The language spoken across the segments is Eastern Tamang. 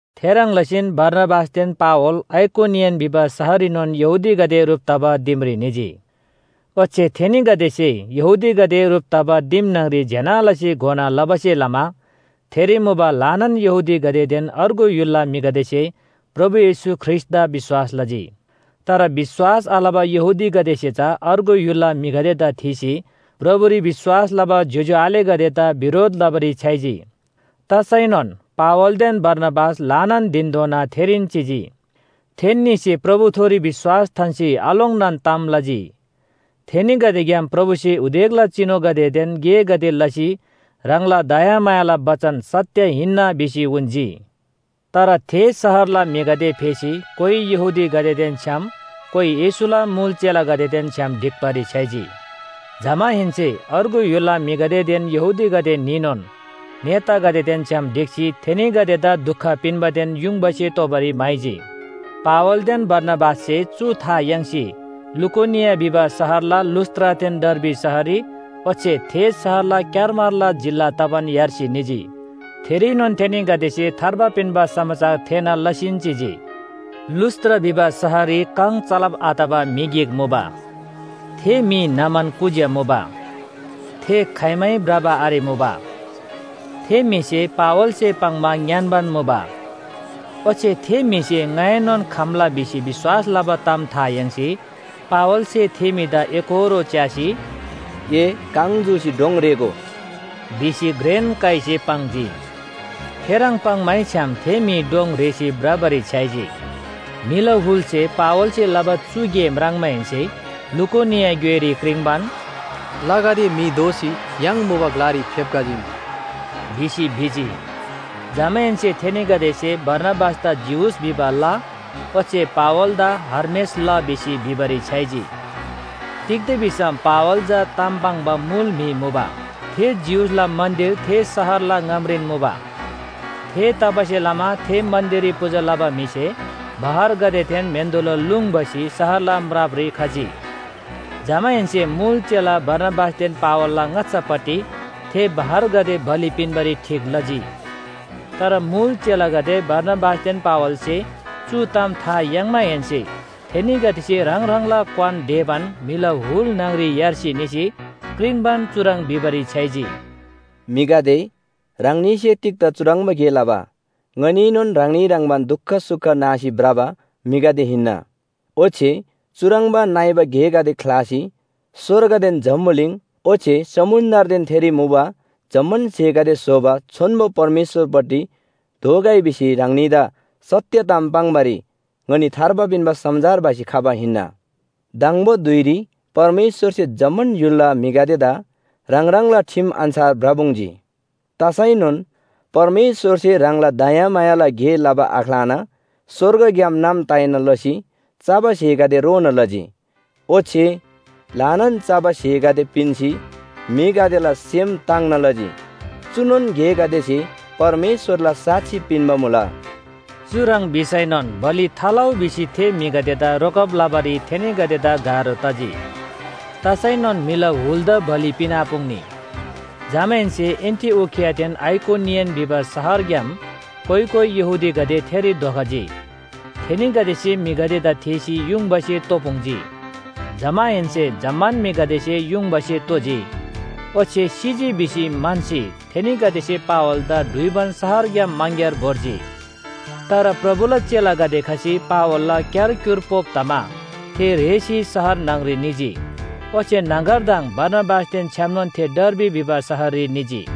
थेह्रङ् लसीन बारनाबासदेन पावल आइकोनियन भिबा शहररीनोन यहूदीगदे ह्रुप तबा दिमरी निजी। ओच्‍छे थेनीगदेसे यहूदीगदे ह्रुप तबा दिम न्‍हङरी ज्‍यना लसी घोना लबासे लमा थेरी मुबा ल्‍हानान यहूदीगदेदेन अर्गु य्‍हुलला म्‍हिगदेसे प्रभु येशू ख्रीष्‍टदा विश्‍वास लजी। तर विश्‍वास आलबा यहूदीगदेसे चा अर्गु य्‍हुलला म्‍हिगदेदा थीसी प्रभुरी विश्‍वास लबा ज्‍योज्‍यो आलेगदेला बिरोध लबारी छ्‌याइजी। तसैनोन पावलदेन बारनाबास ल्‍हानान धिनधोना थेरीन चिजी। थेन्‍नीसे प्रभुथोरी विश्‍वास थान्‍सी आलोङ्नान ताम लजी। थेनीगदेग्‍याम प्रभुसे उदेकला चिनुगदेदेन गेगदे लसी ह्राङला दयामायाला बचन सत्‍य हिन्‍ना भिसी उन्‍जी। तर थे शहरला म्‍हिगदे फेसी कोइ यहूदीगदेदेन छ्‌याम कोइ येशूला मुल चेलागदेदेन छ्‌याम ढिक्‍बारी छ्‌याइजी। जमाहेन्‍से अर्गु य्‍हुलला म्‍हिगदेदेन यहूदीगदे न्‍हीनोन नेतागदेदेन छ्‌याम ढिक्‍सी थेनीगदेदा दुख पिन्‍बादेन युङबासे तोबारी म्‍हाइजी। पावलदेन बारनाबाससे चु था याङ्सी लुकोनिया भिबा शहरला लुस्‍त्रादेन डर्बी शहररी ओच्‍छे थे शहरला क्‍यारमारला जिल्‍ला तबान यार्सी निजी। थेरीनोन थेनीगदेसे थार्बा पिन्‍बा समाचार थेःना लसीन चिजी। लुस्‍त्रा भिबा शहररी काङ चलब आतबा म्‍हि गिक मुबा। थे म्‍हि न्‍हमान कुज्‍या मुबा, थे खाइमै भ्रबा आरेमुबा। थे म्‍हिसे पावलसे पाङ्‌मा ङ्‌यान्‍बान मुबा। ओच्‍छे थे म्‍हिसे ङाएनोन खम्‍ला भिसी विश्‍वास लबा ताम था याङ्सी पावलसे थे म्‍हिदा एकोहोरो च्‍यासी, “ए काङ जूसी डोङ रेःगो” भिसी घ्रेन काइसे पाङ्जी। थेह्रङ् पाङ्‌मैछ्‌याम थे म्‍हि डोङ रेःसी भ्रबारी छ्‌याइजी। म्‍हिला हुलसे पावलसे लबा चु गे म्राङ्माहेन्‍से लुकोनिया ग्‍योइरी क्रिङ्‌बान, “लगदे म्‍हि दोसी य्‍हाङ मुबा ग्‍लारी फेप्‍खजीम” भिसी भिजी। जमाहेन्‍से थेनीगदेसे बारनाबासदा जिउस भिबा ल ओच्‍छे पावलदा हर्मेस ल भिसी भिबारी छ्‌याइजी, तिग्‍दा भिसम पावल चा ताम पाङ्बा मुल म्‍हि मुबा। थे जिउसला मन्‍दिर थे शहरला ङामरीन मुबा। थेतबासेलमा थे मन्‍दिररी पूजा लबा म्‍हिसे बहरगदेदेन म्‍हेन्‍दोला लुङ भसी शहरला म्रापरी खजी। जमाहेन्‍से मुल चेला बारनाबासदेन पावलला ङाच्‍छापट्टि थे बाहरगदे बलि पिन्‍बारी ठीक लजी। तर मुल चेलागदे बारनाबासदेन पावलसे चु ताम था याङ्माहेन्‍से थेनीगदेसे ह्राङ ह्राङला क्‍वान ढेबान म्‍हिला हुल न्‍हङरी यार्सी निसी क्रिङ्बान चुह्रङ् भिबारी छ्‌याइजी। “म्‍हिगदे! ह्राङनीसे तिग्‍दा चुह्रङ्बा गे लबा? ङनीएनोन ह्राङनी ह्रङ्‌बान दुख सुख नासी भ्रबा म्‍हिगदे हिन्‍ना, ओच्‍छे चुह्रङ्बा नइबा गेगदे ख्‍लासी स्‍वर्गदेन जम्‍बुलिङ ओच्‍छे समुन्‍द्रदेन थेरी मुबा जम्‍मान स्‍हेगदे स्‍होबा छोन्‍बो परमेश्‍वरपट्टि दोःगै भिसी ह्राङनीदा सत्‍य ताम पाङ्‌बारी ङनी थार्बा पिन्‍बा समाचार भसी खबा हिन्‍ना। दङबो धुइरी परमेश्‍वरसे जम्‍मान य्‍हुलला म्‍हिगदेदा ह्राङ ह्राङला ठिम अन्‍छार भ्रपुङ्‌जी, तसैनोन परमेश्‍वरसे ह्राङला दयामायाला गे लबा आख्‍लाना स्‍वर्गग्‍याम नाम ताइना लसी चबा स्‍हेगदे रोना लजी। ओच्‍छे ल्‍हानान चबा स्‍हेगदे पिन्‍सी म्‍हिगदेला सेम ताङ्ना लजी। चुनोन गेगदेसे परमेश्‍वरला साक्षी पिन्‍बा मुला।” चुह्रङ् भिसैनोन बलि थालउ भिसी थे म्‍हिगदेदा रोकब लबारी थेनीगदेदा गाह्रो तजी। तसैनोन म्‍हिला हुलदा बलि पिन्‍आपुङ्‌नी। जमाहेन्‍से एन्‍टिओखियादेन आइकोनियन भिबा शहरग्‍याम कोइ कोइ यहूदीगदे थेरी धोखजी। थेनीगदेसे म्‍हिगदेदा थीसी युङबासे तोपुङ्‌जी। जमाहेन्‍से जम्‍मान म्‍हिगदेसे युङबासे तोजी, ओच्‍छे सिजी भिसी म्‍हन्‍सी थेनीगदेसे पावलदा डुइबान शहरग्‍याम मङग्‍यार भोर्जी। तर प्रभुला चेलागदे खसी पावलला क्‍यारक्‍युर पोप तमा थे रेःसी शहर न्‍हङरी निजी। ओच्‍छे न्‍हङगरदङ बारनाबासदेन छ्‌यामनोन थे डर्बी भिबा शहररी निजी।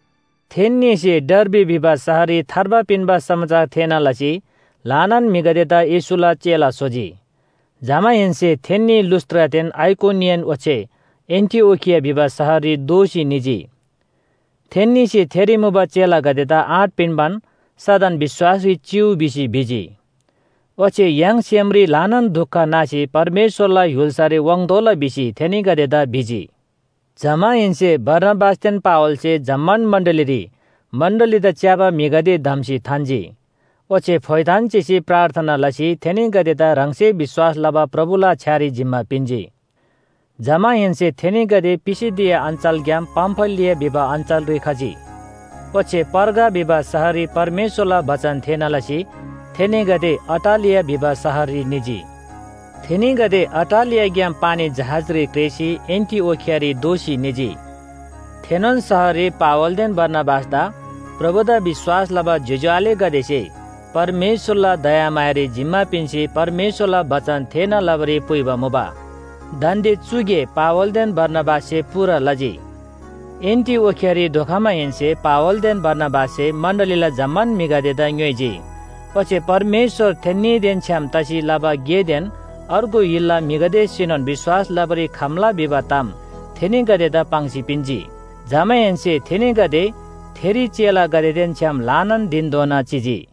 थेन्‍नीसे डर्बी भिबा शहररी थार्बा पिन्‍बा समाचार थेःना लसी ल्‍हानान म्‍हिगदेदा येशूला चेला स्‍होजी। जमाहेन्‍से थेन्‍नी लुस्‍त्रादेन आइकोनियन ओच्‍छे एन्‍टिओखिया भिबा शहररी दोःसी निजी। थेन्‍नीसे थेरी मुबा चेलागदेदा आँट पिन्‍बान सदन विश्‍वासरी चिउ भिसी भिजी। ओच्‍छे य्‍हाङ सेमरी ल्‍हानान दुख नासी परमेश्‍वरला य्‍हुल्‍सारी वाङ्‌तोःला भिसी थेनीगदेदा भिजी। जमाहेन्‍से बारनाबासदेन पावलसे जम्‍मान मण्‍डलीरी मण्‍डलीदा च्‍याबा म्‍हिगदे धम्‍सी थान्‍जी। ओच्‍छे फोइथान चिसी प्रार्थना लसी थेनीगदेदा ह्राङसे विश्‍वास लबा प्रभुला छ्‌यारी जिम्‍मा पिन्‍जी। जमाहेन्‍से थेनीगदे पिसिदिया अञ्‍चलग्‍याम पामफिलिया भिबा अञ्‍चलरी खजी। ओच्‍छे पर्गा भिबा शहररी परमेश्‍वरला बचन थेःना लसी थेनीगदे अटालिया भिबा शहररी निजी। थेनीगदे अटालियाग्‍याम पानी जहाजरी क्रेःसी एन्‍टिओखियारी दोःसी निजी। थेनोन शहररी पावलदेन बारनाबासदा प्रभुदा विश्‍वास लबा ज्‍योज्‍यो आलेगदेसे परमेश्‍वरला दयामायारी जिम्‍मा पिन्‍सी परमेश्‍वरला बचन थेःना लबारी पुइबा मुबा। दान्‍दे चु गे पावलदेन बारनाबाससे पूरा लजी। एन्‍टिओखियारी धोखमाहेन्‍से पावलदेन बारनाबाससे मण्‍डलीला जम्‍मान म्‍हिगदेदा ङ्‌योइजी। ओच्‍छे परमेश्‍वर थेन्‍नीदेन छ्‌याम तसी लबा गेदेन अर्गु य्‍हुलला म्‍हिगदेसेनोन विश्‍वास लबारी खम्‍ला भिबा ताम थेनीगदेदा पाङ्सी पिन्‍जी। जमाहेन्‍से थेनीगदे थेरी चेलागदेदेन छ्‌याम ल्‍हानान धिनधोना चिजी।